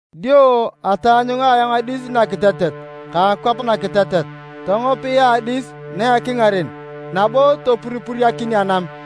Dio ataanyunga ayong adis nakitetet ka akwap nakitetet. Tongopia adis na a ekingaren nabo topuripuriakin anam.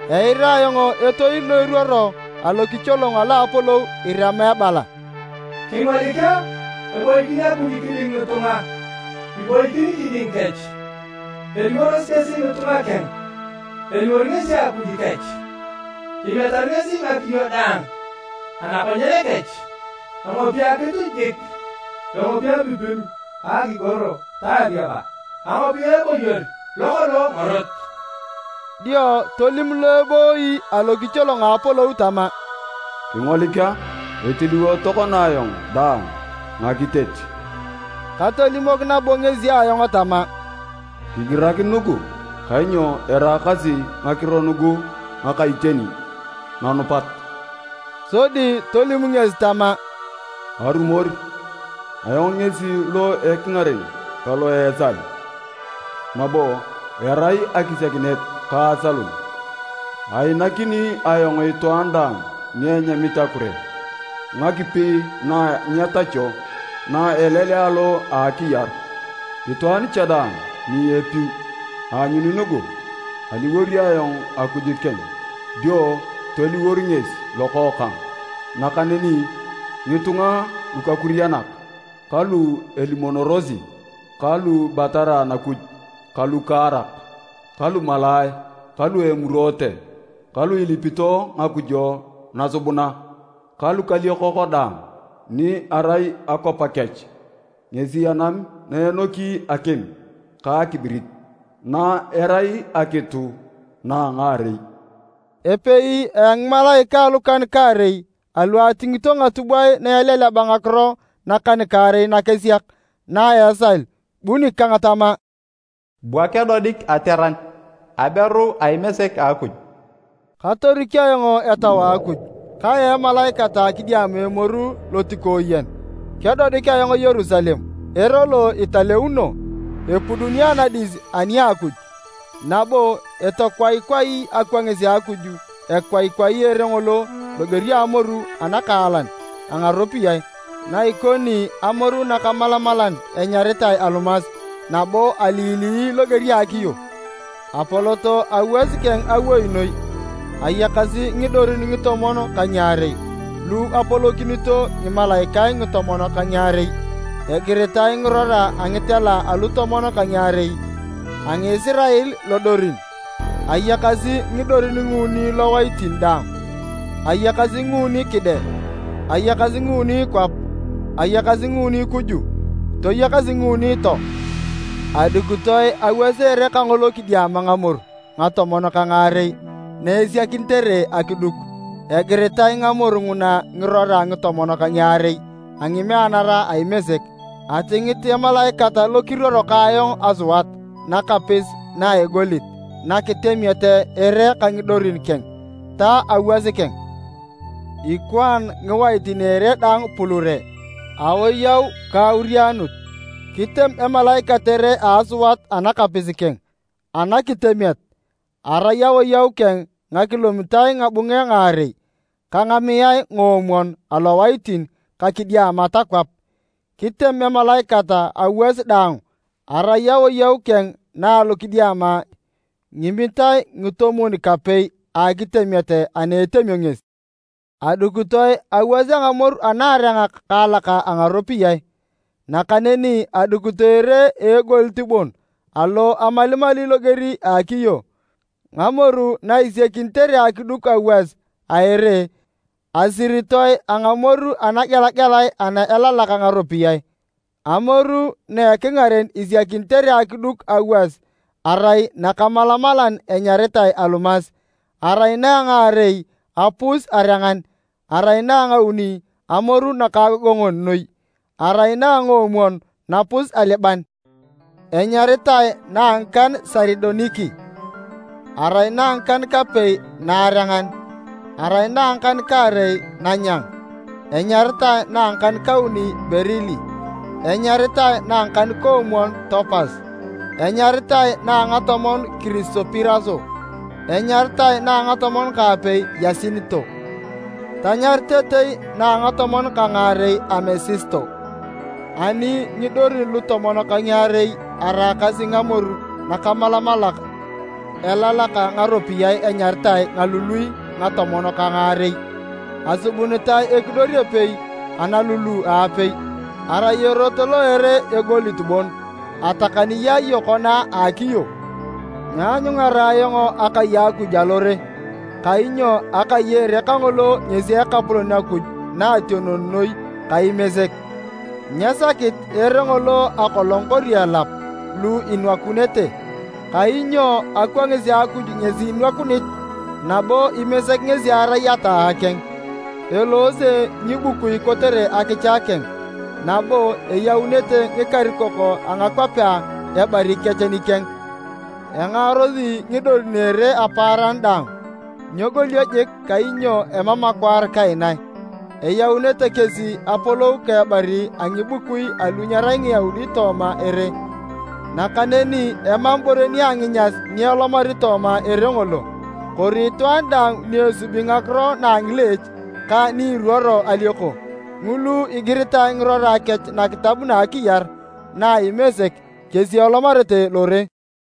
Eira ayong etoil lo eruoro alokicholong alo apolou irema ebala, “Kingolik a! Eboikin Akuj kiding ngitunga. Iboikin kiding kech, eliworosi kesi ngitunga keng, eliwor ngesi Akuj kech. Emiatari ngesi ngakiyo daang anakonyen kech. Engopi akitu jik, engopi apipilu ka akigoro ta ariaba. Angopia eboyor lokolong ngorot.” Dio tolim lo ebooiy alokicholong a apolou tama, “Kingolik a! Etiliwo tokona ayong daang ngakitet!” Katolimok nabo ngesi ayong tama, “Kigirak nugu, kainyo eraakasi ngakiro nugu ngaka iteni nanupat.” Sodi tolim ngesi tama, “Arumor! Ayong ngesi lo ekingaren ka lo a esal, nabo arai akisiakinet ka asalun. Ainakini ayong itwaan daang ni enyamit akure, ngakipi na nyetachio na a elelea alo a akiyar. Itwaan cha daang ni epiu, eanyuni nugu, Aliwor ayong Akuj keng, dio toliwor ngesi lokookang. Nakaneni ngitunga lukakurianak ka lu elimonorosi ka lu ibatara Anakuj ka lukaarak ka lumalaae ka lu emuroote ka lu ilipito ngakujo nasubuna ka lukaliokok daang, ni erai akwap kech ngesi anam na enoki akim ka akibirit, na erai akitu na a ngaarei.” Epei a ngimalaikae a lukan-kaarei alu atingito ngatubwae na eleleba ngakiro nakan-kaarei nakesiak na a esal, bu nikang tama, “Bua kedodik ateran, aberu a Imesek a Akuj.” Katorik ayong etau a Akuj, kayaa emalaikat kidiama emoru lotikooyen. Kedodik ayong Yerusalem, ere lo italeuno, epuduni anadis ani a Akuj, nabo etokwaikwai akwangis a Akuj. Ekwaikwai ere ngolo loger a amoru anakaalan a ngaropiyae, na ikoni amoru nakamalamalan enyaritae alumas nabo alilii loger a akiyo. Apolot awas keng awoi noi, ayakasi ngidorin ngitomon ka ngiarei lu apolokinito ngimalaikae ngitomon ka ngiarei. Egiritae ngirora a ngitela a lutomon ka ngiarei a Ngisirael lodorin. Ayakasi ngidorin nguuni lowaitin daang, ayakasi nguuni kide, ayakasi nguuni kwap, ayakasi nguuni kuju, toyakas nguuni too. Adukitoe awas a ere kangolo kidiama ngamoru ngatomon ka ngaarei na esiakinitere akiduk. Egiritae ngamoru nguna ngirora ngitomon ka ngiarei a ngimeanara a Imesek. Atingit emalaikat lo kiruoro ka ayong asuat nakapis na a egolit, nakitemiet ere ka ngidorin keng, ta awas keng. Ikwaan ngiwaitin a ere daang pulure, awoyau ka aurianut. Kitem emalaikat ere a asuat anakapis keng anakitemiet, arai awoyau keng ngakilomitae ngabunge ngaarei ka ngamiae ngoomwon alowaitin ka kidiama ta kwap. Kitem emalaikat awas dang, arai awoyau keng na alokidiama ngimitae ngitomwon-kapei a akitemiet ana etemio ngesi. Adukitoe awas a ngamoru anaarengak kaalak a ngaropiyae, nakaneni adukitoe ere a egolit bon, alo amalimali loger a akiyo. Ngamoru na isiakinitere akiduk awas a ere, asiritoe a ngamoru anagelagelae ana elalak ngaropiyae. Amoru na ekingaren isiakinitere akiduk awas arai nakamalamalan enyaritae alumas arai na a ngaarei apus-arengan, arai na a ngauni amoru nakaagongon noi, arai na a ngoomwon napus-aliban, enyaritae na a ngikan saridoniki, arai na ngikan-kapei naarengan, arai na a ngakan-kaarei nanyang, enyaritae na a ngakan-kauni berili, enyaritae na a ngakan-koomwon topas, enyaritae na a ngatomon kirisopiraso, enyaritae na a ngatomon ka apei yasinito, tanyaritetei na a ngatomon ka ngaarei amesisto. Ani ngidorin lutomon ka ngiarei araakasi ngamoru nakamalamalak elalak ngaropiyae enyaritae ngalului ngatomon ka ngaarei. Asubunitae ekidor epei analulu a apei. Arai erot lo a ere egolit bon, atakani yaaye kona a akiyo. Nyeanyungara ayong akai a Akuj alore, kainyo akai a ere kangolo ngesi Ekapolon Akuj Naationon Noi ka Imesek. Nyesakit ere ngolo akolong kori elap lu inwakunete, kainyo akwangis a Akuj ngesi inwakunit, nabo Imesek ngesi erai ataa keng. Eloose ngibukui kotere akicha keng, nabo eyaunete ngikarikok a ngakwapea ebari kech nikeng. Engaarosi ngidorin a ere apaaran daang, nyegolio jik kainyo emam akwaar kaina. Eyaunete kesi apolou ka ebari a ngibukui alu nyerai Ngiyaudi tooma ere. Nakaneni emam ibore nia nginyas ni elomari tooma ere ngolo, kori itwaan daang ni esubi ngakiro na a ngileech ka ni iruoro alioko. Ngulu igiritae ngirora kech nakitab na a akiyar na a Imesek, kesi elomarete lore.